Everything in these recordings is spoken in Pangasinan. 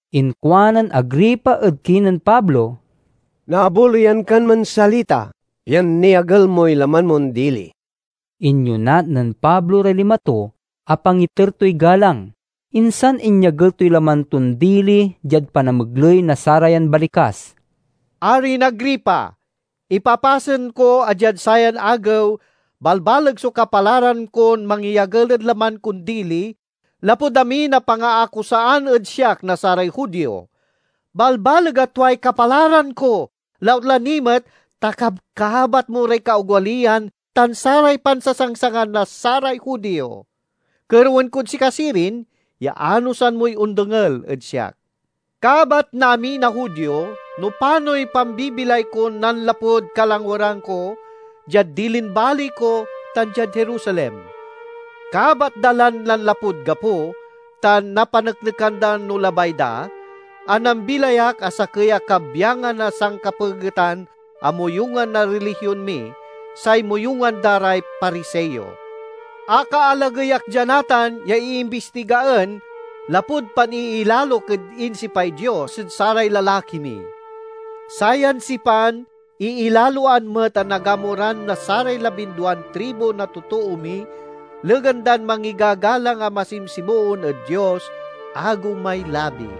Inkuanen Agripa ed kinen Pablo, "Naabuloyan kan mansalita, pian niagel moy laman mon dili." Inyonat nen Pablo ray lima to a pangiter toy galang, insan inyagel toy laman ton dili diad panamegley na sarayan balikas: "Arin Agripa, ipapasen ko a diad sayan agew balbaleg so kapalaran kon mangyagel ed laman kon dili lapud amin a pangaakusaan ed siak na saray Judio. Balbaleg a tuay kapalaran ko, lautla ni met ta kabkabat mo ray kaogaliyan tan saray pansasangsangan na saray Judio. Kerewen kod sika sirin ya anosan moy ondengel ed siak. "Kabat na amin a Judio no panoy pambibilay kon nanlapud kalangweran ko, diad dilin baley ko tan diad Jerusalem. Kabat da lan nanlapud gapo, tan napaneknekan da no labay da, a nambilay ak a sakey a kabyangan na sankapegetan a moyungan na rilihion mi, say moyungan da ray Pariseo. Akaalagey ak dia natan ya iimbistigaen, lapud paniilalok ed insipay Dios ed saray lalaki mi. Sayan sipan iilaloan met a nagamuran na saray labinduan tribu na totoo mi, legan dan mangigagalang a masimsimoon ed Dios, agew may labi.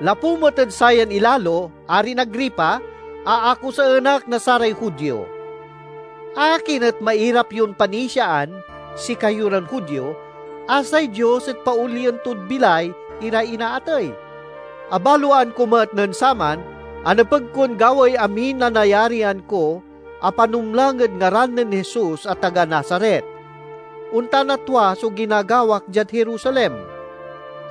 Lapu met ed sayan ilalo. Arin Agripa, aakusaen ak na saray Judio! Akin et mairap yon panisiaan, sikayo ran Judio, a say Dios et paolien tod bilay iray inaatey? "Abaloan ko met nen saman a nepeg kon gawaey amin a nayarian ko a panumlang ed ngaran nen Jesus a taga Nazaret. Ontan a tua so ginagawak diad Jerusalem.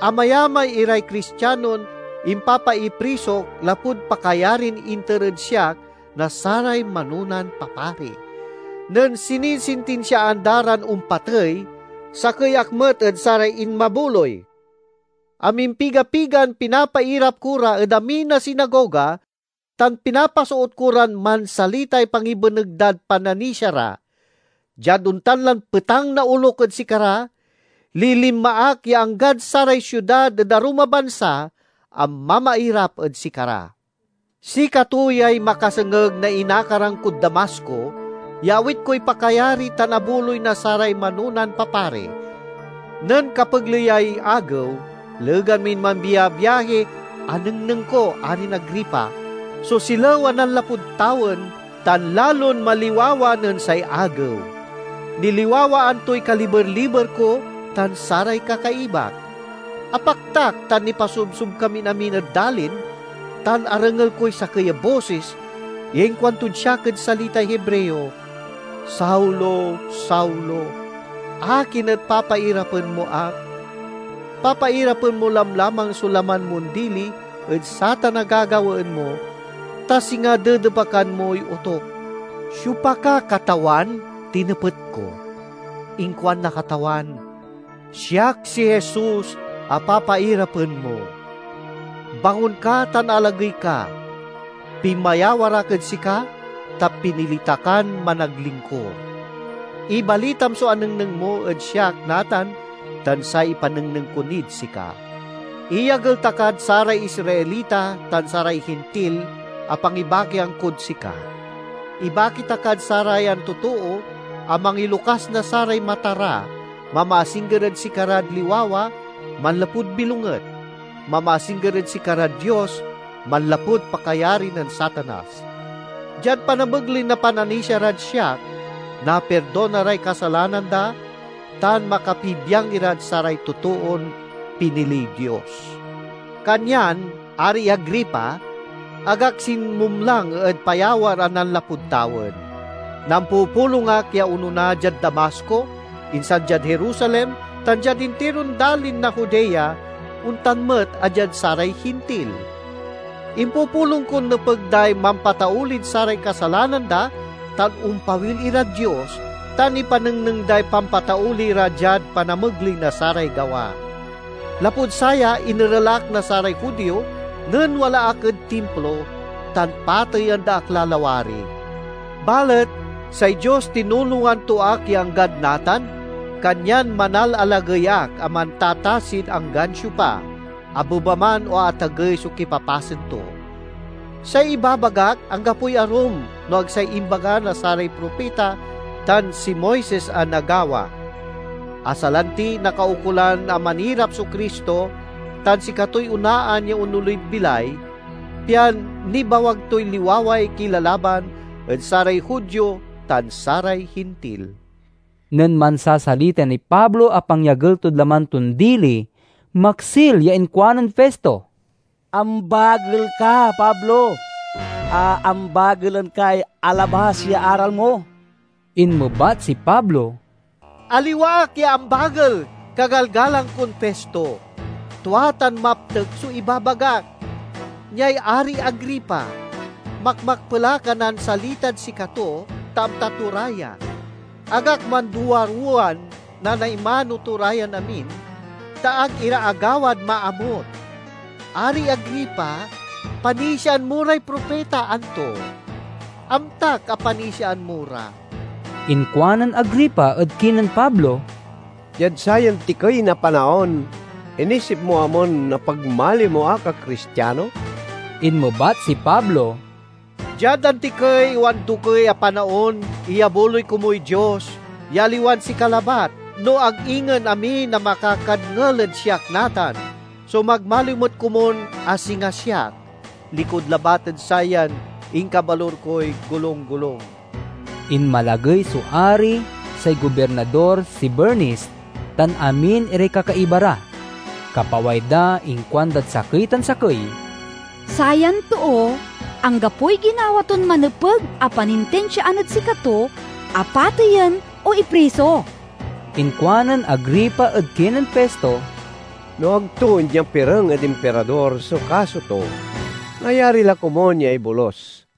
Amayamay iray Cristianon impapaiprisok lapud pakayarin inter ed siak na saray manonan papari; nen sinisintinsiaan da ran ompatey, sakey ak met ed saray inmabuloy. Amimpiga-pigan pinapairap ko ra ed amin a sinagoga, tan pinapasoot ko ran mansalitay pangibeneg dad pananisia ra. Diad ontan lan petang na olok ed sikara, lilinma ak ya anggad saray siudad ed arum a bansa a mamairap ed sikara." "Sikato yay makasengeg na inakaran kod Damasco, ya awit koy pakayari tan abuloy na saray manonan papari. Nen kapegleyay agew, legan min mambiabiahi, anengneng ko, Arin Agripa, so silew a nanlapud tawen tan lalon maliwawa nen say agew. Niliwawaan toy kaliber-liber ko tan saray kakaibak. Apaktak tan nipasobsob kamin amin ed dalin, tan arengel koy sakey a bosis ya inkuantod siak ed salitay Hebreo, 'Saulo, Saulo, akin et papairapen mo ak? Papairapen mo lamlamang so laman mon dili ed satan a gagawaen mo, ta singa dedepakan moy otuk.' 'Siopa ka, Katawan?' tinepet ko. Inkuan na Katawan, 'Siak si Jesus a papairapen mo. Bangon ka tan alagey ka! Pinmayawar ak ed sika, ta pinili ta kan managlingkur. Ibalitam so anengneng mo ed siak natan tan say ipanengneng ko nid sika. Iyagel ta kad saray Israelita tan saray Hintil a pangibakian kod sika. Ibaki ta kad sarayan totoo a mangilokas na saray mata ra, mamaasingger ed sikarad liwawa manlapud bilonget, mamaasingger ed sikarad Dios manlapud pakayari nen Satanas! Diad panamegley na pananisia rad siak, napirdona ray kasalanan da tan makapibiang irad saray totoon piniliy Dios!'" "Kanyan, Ari Agripa, ag ak sinmumlang ed payawar a nanlapud tawen. Nampupulong ak ya onona diad Damasco, insan diad Jerusalem tan diad intiron dalin na Judea, ontan met a diad saray Hintil. Impupulong kon nepeg day mampataulid saray kasalanan da tan ompawil irad Dios, tan ipanengneng day pampatauli ra diad panamegley na saray gawa. Lapud saya, inerel ak na saray Judio nen wala ak ed Timplo, tan pateyen da ak la lawari. Balet say Dios tinulongan to ak ya anggad natan, kanyan manalalagey ak a mantatasid anggan siopa, abeba man o atagey so kipapasen to. Say ibabagak anggapoy arum no ag say imbaga na saray propita tan si Moises a nagawa, a salanti, nakaukolan a manirap so Cristo tan sikatoy onaan ya onolid bilay, pian nibawag toy liwaway kilalaban ed saray Judio tan saray Hintil." Nen mansasalita niy Pablo a pangyagel tod laman ton dili, maksil ya inkuanen Festo, "Ambagel ka, Pablo! Aambagelen kay alabas ya aral mo!" Inmebat si Pablo, "Aliwa ak ya ambagel, kagalgalang kon Festo! Tua tan maptek so ibabagak. Niay Ari Agripa! Makmakpel ak a nansalitad sikato, ta amta to ra ya. Ag ak manduaruwan nanaimano to ra yan amin, ta ag ira agawad maamut. Ari Agripa, panisiaan mo ray propita, anto? Amtak a panisiaan mo ra!" Inkuanen Agripa ed kinen Pablo, "Diad sayan tikey na panaon, inisip mo amon napagmaliw mo ak a Cristiano!" Inmebat si Pablo, "Diad antikey o andokey a panaon, iyabuloy komuy Dios ya aliwan sika labat, no ag ingen amin a makakadngel ed siak natan, so magmaliw met komun a singa siak—likud labat ed sayan inkabalur koy golung-golung!" Inmalagey so Ari, say Gobirnador, si Bernice, tan amin iray kakaiba ra. Kapaway da inkuandad sakey tan sakey, "Sayan too anggapoy ginawa ton manepeg a panintinsiaan ed sikato a pateyen o ipriso." Inkuanen Agripa ed kinen Festo, "No ag to inyapireng ed Impirador so kaso to, nayari la komun ya ibolus."